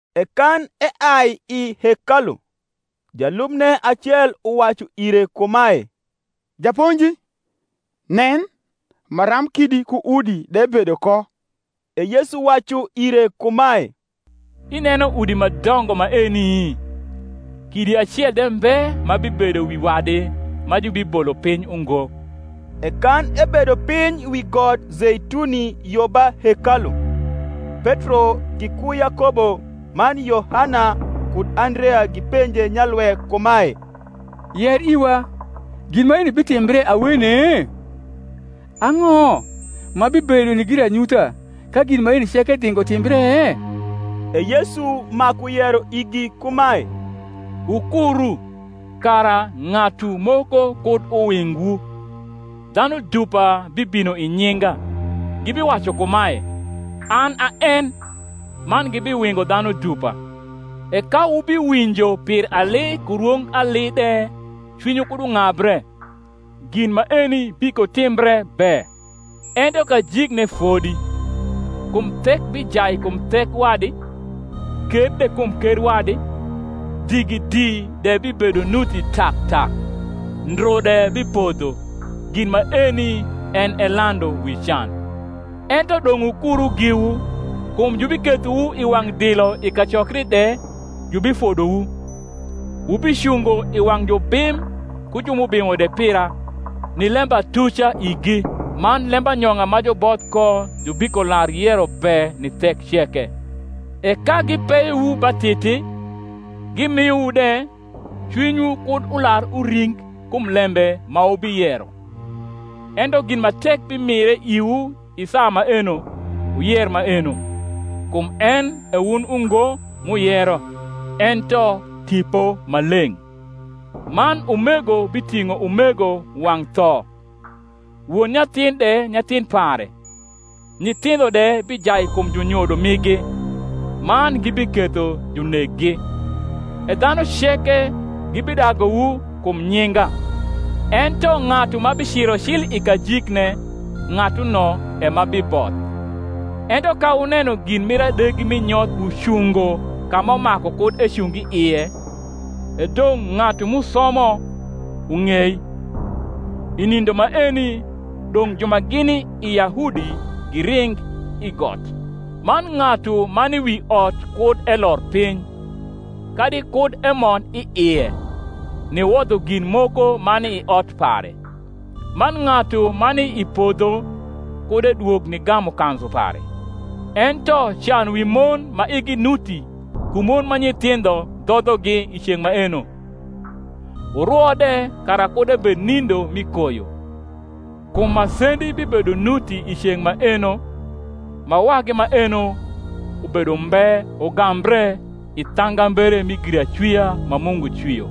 E kan eai i hekalu, jalubne acel uwacu ire kumae, Japonji, nen, maram kidi ku udi de bedo ko! E Yesu wacu ire kumae, Ineno udi ma dongo maeni? kidi acel de mbe ma bibedo wi wadi ma jubibolo piny ungo. E kan ebedo piny wi got Zeituni yo ba hekalu, Petro giku Yakobo man Yohana kud Andrea gipenje nyalwe kumae, Yer iwa, gin maeni bitimbre awene? ang’o ma bibedo ni giranyutha ka gin maeni ceke dhingo timbre? E Yesu maku yero igi kumae, Wukuru, kara ng’atu moko kud uwingwu. Dhanu dupa bibino i nyinga, gibiwacu kumae, An a en; man gibiwingo dhanu dupa. E ka wubiwinjo pir ali ku rwong ali de cwinywu kud ung’abre: gin maeni bikotimbre be; ento kajikne fodi. Kum thek bijai kum thek wadi, ker de kum ker wadi; digidi de bibedo nuti tak tak; ndru de bipodho: gin maeni en e landu wi can. Ento dong’ wukuru giwu: kum jubikethowu i wang’ dilo i kacokri de jubifodowu; wubicungo i wang’ jubim ku ju m’ubimo de pira, ni lembatuca igi. Man lembanyong’a ma juboth ko jubikolar yero be ni thek ceke. E ka gipeyowu ba titi, gimiowu de, cwinywu kud ular uring kum lembe ma wubiyero: ento gin ma tek bimire iwu i saa maeno, wuyer maeno; kum en e wun ungo m’uyero, ento Tipo Maleng’. Man umego biting’o umego wang’ tho, won nyathin de nyathin pare; nyithindho de bijai kum junyodo migi, man gibiketho juneggi. E dhanu ceke gibidaguwu kum nyinga: ento ng’atu ma biciro cil i kajikne, ng’atuno e ma biboth. Ento ka wuneno gin mir adegi mi nyoth ucungo ka ma maku kud ecung i ie (e dong’ ng’atu m’usomo ung’ei), i nindo maeni dong’ ju ma gini i Yahudi giring i got: man ng’atu ma ni wi ot kud elor piny, kadi kud emond i ie, niwodho gin moko ma ni i ot pare: man ng’atu ma ni i podho kud edwog nigamu kanzu pare. Ento can wi mon ma igi nuti ku mon ma nyithindho dhodhogi i ceng’ maeno! Wurwo de kara kud ebed i nindo mi koyo. Kum masendi bibedo nuti i ceng’ maeno, ma wagi maeno ubedo umbe ugambre i thangambere mi giracwia ma Mungu cwio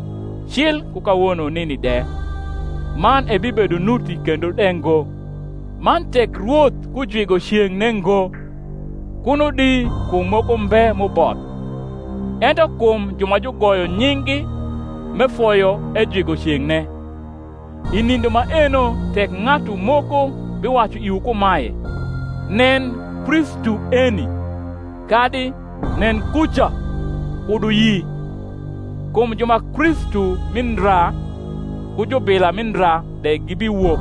cil ku kawono nini de, man ebibedo nuti kendo de ngo. Man tek Rwoth kujwigo ceng’ne ngo, kuno di kum moko mbe m’uboth; ento kum ju ma jugoyo nying’gi, m’efoyo, ejwigo ceng’ne. I nindo maeno tek ng’atu moko biwacu iwu kumae, Nen, Kristu eni: kadi, Nen, kuca: kud wuyi: kum ju ma Kristu mi ndra ku jubila mi ndra de gibiwok,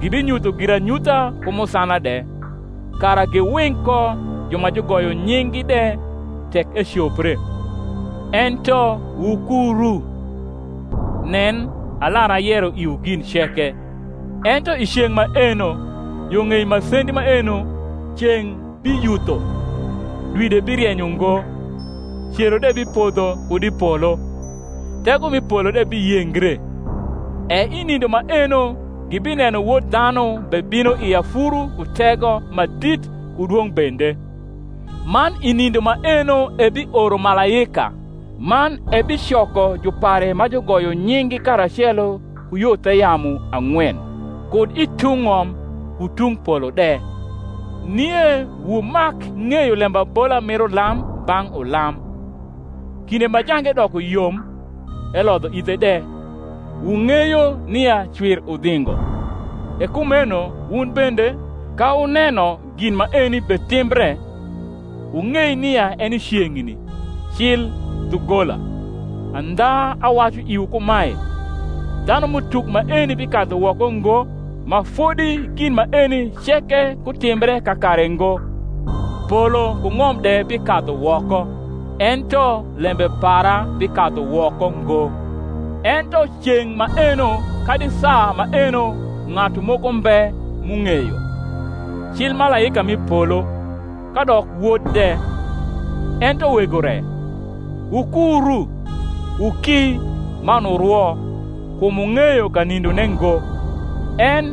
gibinyutho giranyutha ku musana de, kara giwing ko ju ma jugoyo nying’gi de, tek ecopre. Ento wukuru: nen, alar ayero iwu gin ceke. Ento i ceng’ maeno, yo ng’ei masendi maeno, ceng’ biyutho, dwi de birieny ungo, cero de bipodho kud i polo, tego mi polo de biyengre. E i nindo maeno gibineno Wod dhanu bebino i afuru ku tego ma dit ku dwong’ bende. Man i nindo maeno ebioro malaika, man ebicoko jupare ma jugoyo nying’gi karacelo ku yo the yamu ang’wen, kud i tung’ ng’om ku tung’ polo de. Nie wumak ng’eyo lembabola mir ulam bang’ ulam: kinde ma jange doko yom, elodho ithe de, wung’eyo nia cwir udhingo: e kumeno wun bende, ka wuneno gin maeni betimbre, wung’ei nia eni ceng’ni, cil dhugola. Andha awacu iwu kumae, Dhanum’utuk maeni bikadhu woko ngo, ma fodi gin maeni ceke kutimbre kakare ngo: polo ku ng’om de bikadhu woko: ento lembe para bikadhu woko ngo. Ento ceng’ maeno kadi saa maeno ng’atu moko mbe m’ung’eyo, cil malaika mi polo, kadok Wod de, ento Wego re. Wukuru, wuki man wurwo: kum wung’eyo kanindone ngo. En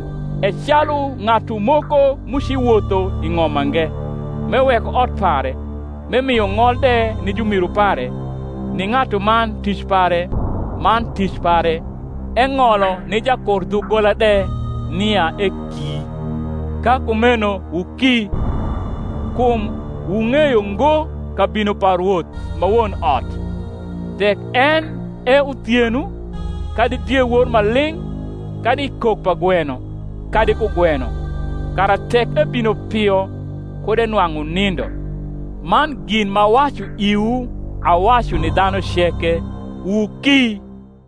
e calu ng’atu moko, m’uci wotho i ng’om mange, m’eweko ot pare, m’emio ng’ol de ni jumiru pare, ni ng’atuman tic pare man tic pare, eng’olo ni jakurdhugola de nia eki. Ka kumeno wuki: kum wung’eyo ngo kabino pa rwoth ma won ot, tek en e uthieno, kadi diewor ma ling’, kadi i kok pa gweno, kadi kugweno; kara tek ebino pio kud enwang’ wunindo. Man gin m’awacu iwu awacu ni dhanu ceke, Wuki.